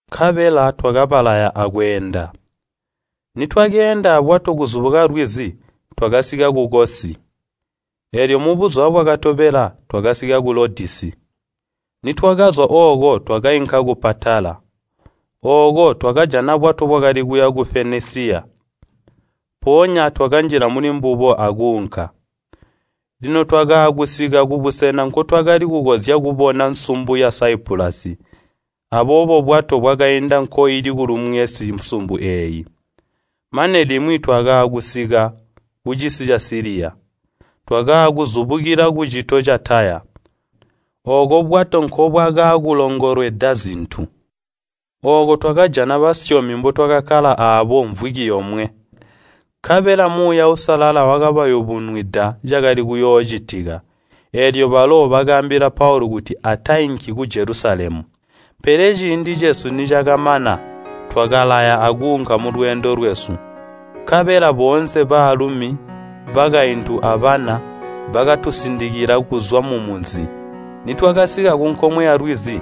Nkabela twakabalaya akweenda. Nitwakeenda abwato kuzubuka lwizi, twakasika ku Kosi, eelyo mubuzuba bwakatobela twakasika ku Lodisi. Nitwakazwa ooko twakainka ku Patala. Ooko twakajana bwato bwakali kuya ku Fenesiya, mpoonya twakanjila mulimbubo akuunka. Lino twakaakusika kubusena nkotwakali kukonzya kubona nsumbu ya Saipulasi, aboobo bwato bwakainda nkoili kulumwensi nsumbu eeyo, mane limwi twaakusika kucisi ca Siliya. Twakaakuzubukila kucito ca Taya, ooko bwato nkobwakaakulongolwedwa zintu. Ooko twakajana basyomi mbotwakakkala aabo mvwiki yomwe. Nkabela Muuya Uusalala wakabayubunwida cakali kuyoocitika, eelyo balo bakaambila Paulu kuti atainki ku Jelusalemu. Pele ciindi cesu nicakamana, twakalaya akuunka mulweendo lwesu. Nkabela boonse, baalumi, bakaintu abana, bakatusindikila kuzwa mumunzi, nitwakasika kunkomwe yalwizi,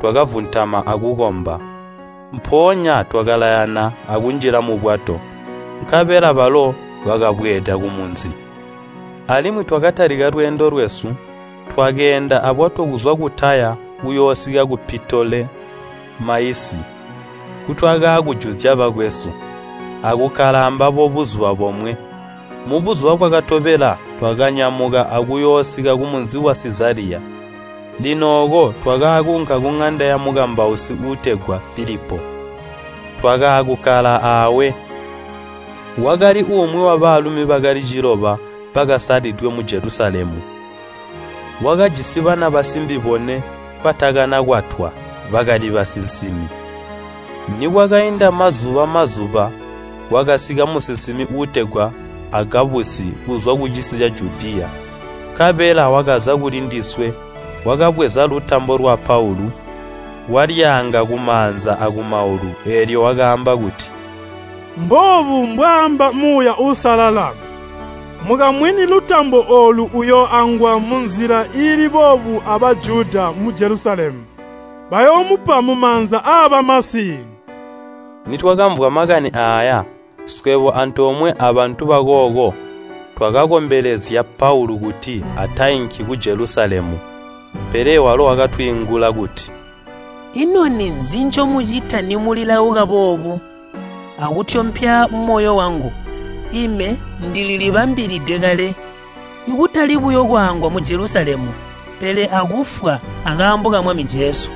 twakavuntama akukomba. Mpoonya twakalayana akunjila mubwato, nkabela balo bakabweeda kumunzi. Alimwi twakatalika lweendo lwesu, twakeenda abwato kuzwa ku Taya kuyoosika ku Pitolemaisi nkutwakaakujuzya bakwesu, akukkala ambabo buzuba bomwe. Mubuzuba bwakatobela twakanyamuka akuyoosika kumunzi wa Sizaliya. Lino ooko twakaakuunka kuŋanda yamukambausi uutegwa Filipo, twakaakukkala awe. Wakali umwi wabaalumi bakali ciloba bakasalidwe mu Jelusalemu. Wakajisi bana basimbi bone batakanakwatwa, bakali basinsimi. Nikwakainda mazuba-azuba kwakasika musinsimi uutegwa Agabusi kuzwa kucisi ca Judiya. Nkabela wakaza kulindiswe, wakabweza lutambo lwa Paulu, walyaanga kumaanza akumaulu, eelyo wakaamba kuti, “Mboobu mbwaamba Muuya Uusalala, ‘Mukamwini lutambo oolu uyooangwa munzila iili boobu a Bajuda mu Jelusalemu, bayoomupa mumaanza aabamasi.’” Nitwakamvwa makani aaya, swebo antoomwe abantu bakooko, twakakombelezya Paulu kuti atainki ku Jelusalemu. Pele walo wakatwiingula kuti, “Ino ninzi ncomucita nimulilauka boobu, akutyompya moyo wangu? Ime ndililibambilide kale, kutali buyo kwaangwa mu Jelusalemu, pele akufwa akaambo ka Mwami Jesu.”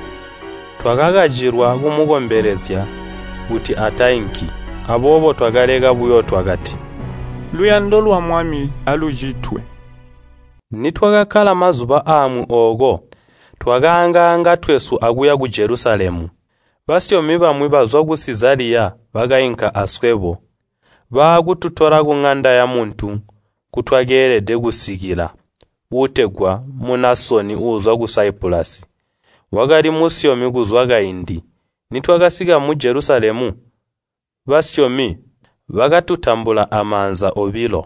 Twakakacilwa kumukombelezya kuti atainki. Aboobo twakaleka buyo twakati, “Luyando lwa Mwami alucitwe.” Nitwakakkala mazuba amwi ooko twakaangaanga twesu akuya ku Jelusalemu. Basyomi bamwi bazwa mu Sizaliya bakainka aswebo, baakututola kuŋanda yamuntu, nkutwakeelede kusikila, uutegwa Munasoni uuzwa ku Saipulasi. Wakali musyomi kuzwa kaindi. Nitwakasika mu Jelusalemu basyomi bakatutambula amaanza obilo.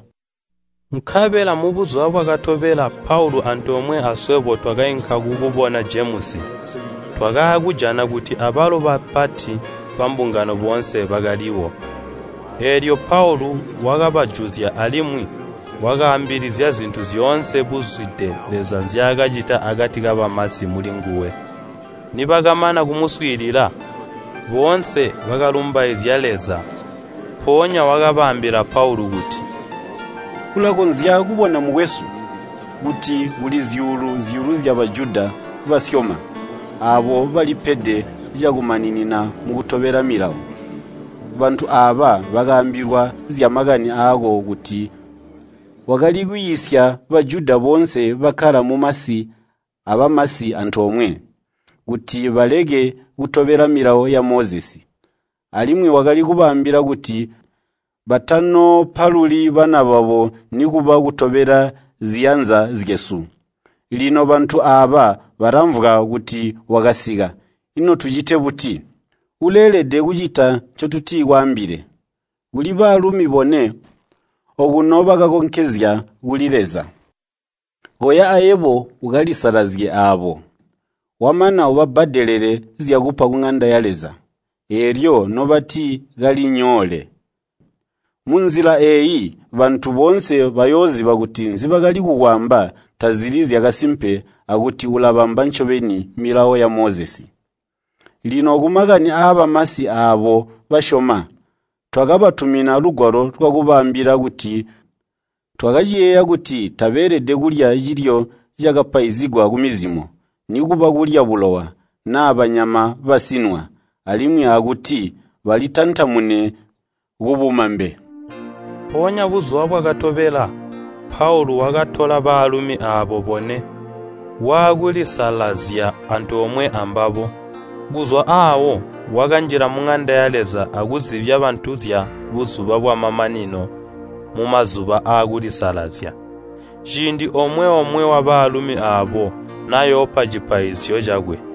Nkabela mubuzuba bwakatobela Paulu antoomwe aswebo twakainka kukubona Jemusi, twakaakujana kuti abalo bapati bambungano boonse bakaliwo. Eelyo Paulu wakabajuzya alimwi wakaambilizya zintu zyoonse buzwide Leza nzyaakacita akati kabamasi mulinguwe. Nibakamana kumuswiilila, boonse bakalumbaizya Leza. Mpoonya bakaambila Paulu kuti, “Ulakonzya kubona, mukwesu, kuti kuli zyuulu-zyuulu zya Bajuda basyoma, aabo balipede cakumaninina mukutobela Milawo. Bantu aaba bakaambilwa zyamakani aako kuti wakali kwiisya Bajuda boonse bakkala mumasi abamasi antoomwe, kuti baleke kutobela Milawo ya Mozesi. Alimwi wakali kubaambila kuti batanoopaluli bana babo nikuba kutobela ziyanza zyesu. Lino bantu aaba balamvwa kuti wakasika, ino tucite buti? Uleelede kucita ncotutikwaambile. Kuli baalumi bone okuno bakakonkezya kuli Leza. Koya ayebo ukalisalazye aabo. Wamana ubabbadelele zyakupa kuŋanda ya Leza, eelyo nobati kalinyoole. Munzila eeyi bantu boonse bayooziba kuti nzibakali kukwaamba tazili zyakasimpe akuti ulabamba ncobeni Milawo ya Mozesi. Lino kumakani aabamasi aabo basyoma, twakabatumina lugwalo lwakubaambila kuti twakaciyeeya kuti tabeelede kulya cilyo cakapaizigwa kumizimo, nikuba kulya bulowa, naa banyama basinwa, alimwi akuti balintantamune kubumambe.” Mpoonya buzuba bwakatobela Paulu wakatola baalumi aabo bone, waakulisalazya antoomwe ambabo. Kuzwa aawo wakanjila muŋanda ya Leza akuzibya bantu zya buzuba bwamamanino mumazuba aakulisalazya, ciindi omwe-omwe wabaalumi aabo nayoopa cipaizyo cakwe.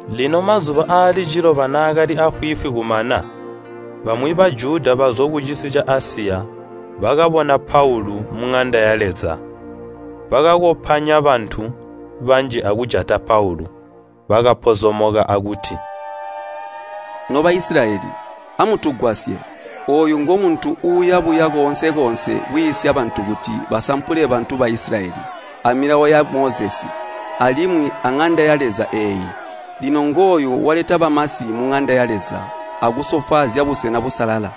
Lino mazuba aali ciloba naakali afwiifwi kumana, bamwi Bajuda bazwa kucisi ca Asiya bakabona Paulu muŋanda ya Leza. Bakakopanya bantu banji akujata Paulu. Bakapozomoka akuti, “No Baisilayeli, amutugwasye! Ooyu ngomuntu uuya buya koonse-koonse kwiisya bantu kuti basampule bantu ba Isilayeli, a Milawo ya Mozesi, alimwi aŋanda ya Leza eeyi. Lino ngooyu waleta bamasi muŋanda ya Leza akusofwaazya busena busalala!”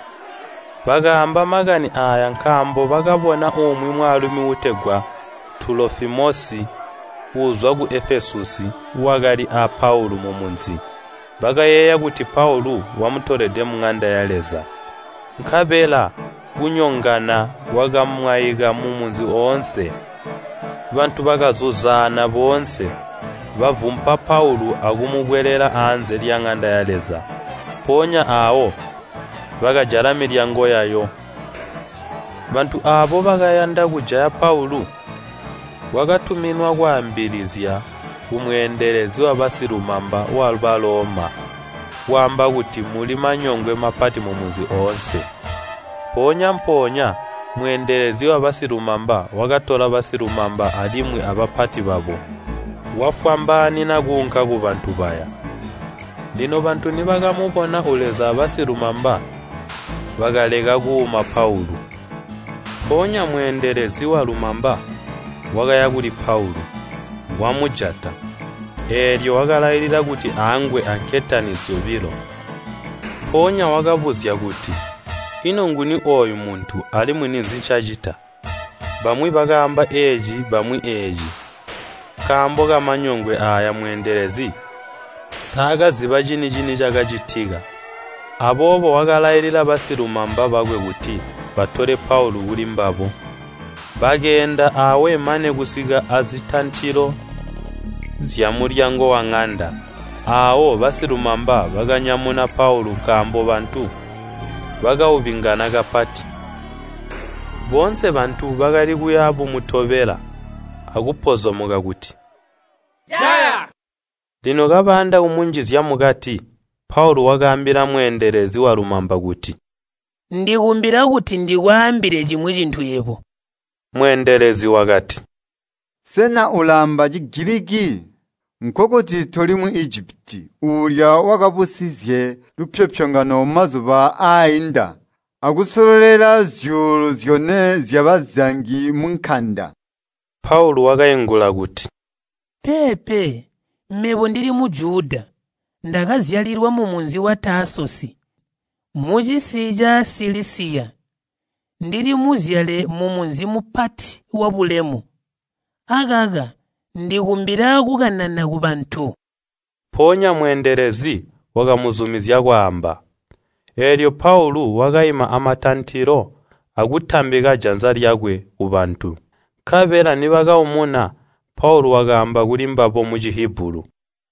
Bakaamba makani aaya nkaambo bakabona umwi mwaalumi uutegwa Tulofimosi uuzwa ku Efesusi, wakali a Paulu mumunzi, bakayeeya kuti Paulu wamutolede muŋanda ya Leza. Nkabela kunyongana kwakamwaika mumunzi oonse, bantu bakazuzaana boonse, bavumpa Paulu akumukwelela aanze lyaŋanda ya Leza. Mpoonya aawo bakajala milyango yayo. Bantu aabo bakayanda kujaya Paulu, kwakatuminwa kwaambilizya kumweendelezi wabasilumamba wa Baloma kwaamba kuti muli manyongwe mapati mumunzi oonse. Mpoonya-mpoonya mweendelezi wabasilumamba wakatola basilumamba alimwi abapati babo, wafwambaanina kuunka kubantu baya. Lino bantu nibakamubona uleza abasilumamba, bakaleka kuuma Paulu. Mpoonya mweendelezi walumamba wakaya kuli Paulu, wamujata, eelyo wakalailila kuti aangwe anketani zyobilo. Mpoonya wakabuzya kuti, “Ino nguni ooyu muntu, alimwi ninzi ncaacita?” Bamwi bakaamba eeci bamwi eeci. Nkaambo kamanyongwe aayo mweendelezi taakaziba cini-cini cakacitika. Aboobo wakalailila basilumamba bakwe kuti batole Paulu kulimbabo. Bakeenda aawe mane kusika azitantilo zyamulyango waŋanda, aawo basilumamba bakanyamuna Paulu nkaambo bantu bakaubingana kapati. Boonse bantu bakali kuya bumutobela akupozomoka kuti, “Jaya!” Lino kabayanda kumunjizya mukati, Paulu wakaambila mweendelezi walumamba kuti, “Ndikumbila kuti ndikwaambile cimwi cintu yebo.” Mweendelezi wakati, “Sena ulaamba Cigiliki? Nkokuti toli Muijipiti uulya wakabusizye lupyopyongano mazuba aainda, akusololela zyuulu zyone zyabazangi munkanda?” Paulu wakaingula kuti, “Peepe, mebo ndili Mujuda, ndakazyalilwa mumunzi wa Taasosi, mucisi ca Silisiya. Ndili muzyale wamunzi mupati wabulemu. Akaka ndikumbila kukanana kubantu.” Mpoonya mweendelezi wakamuzumizya kwaamba. Eelyo Paulu wakaima amatantilo akutambika janza lyakwe kubantu. Nkabela nibakaumuna, Paulu wakaamba kulimbabo mu Cihibulu,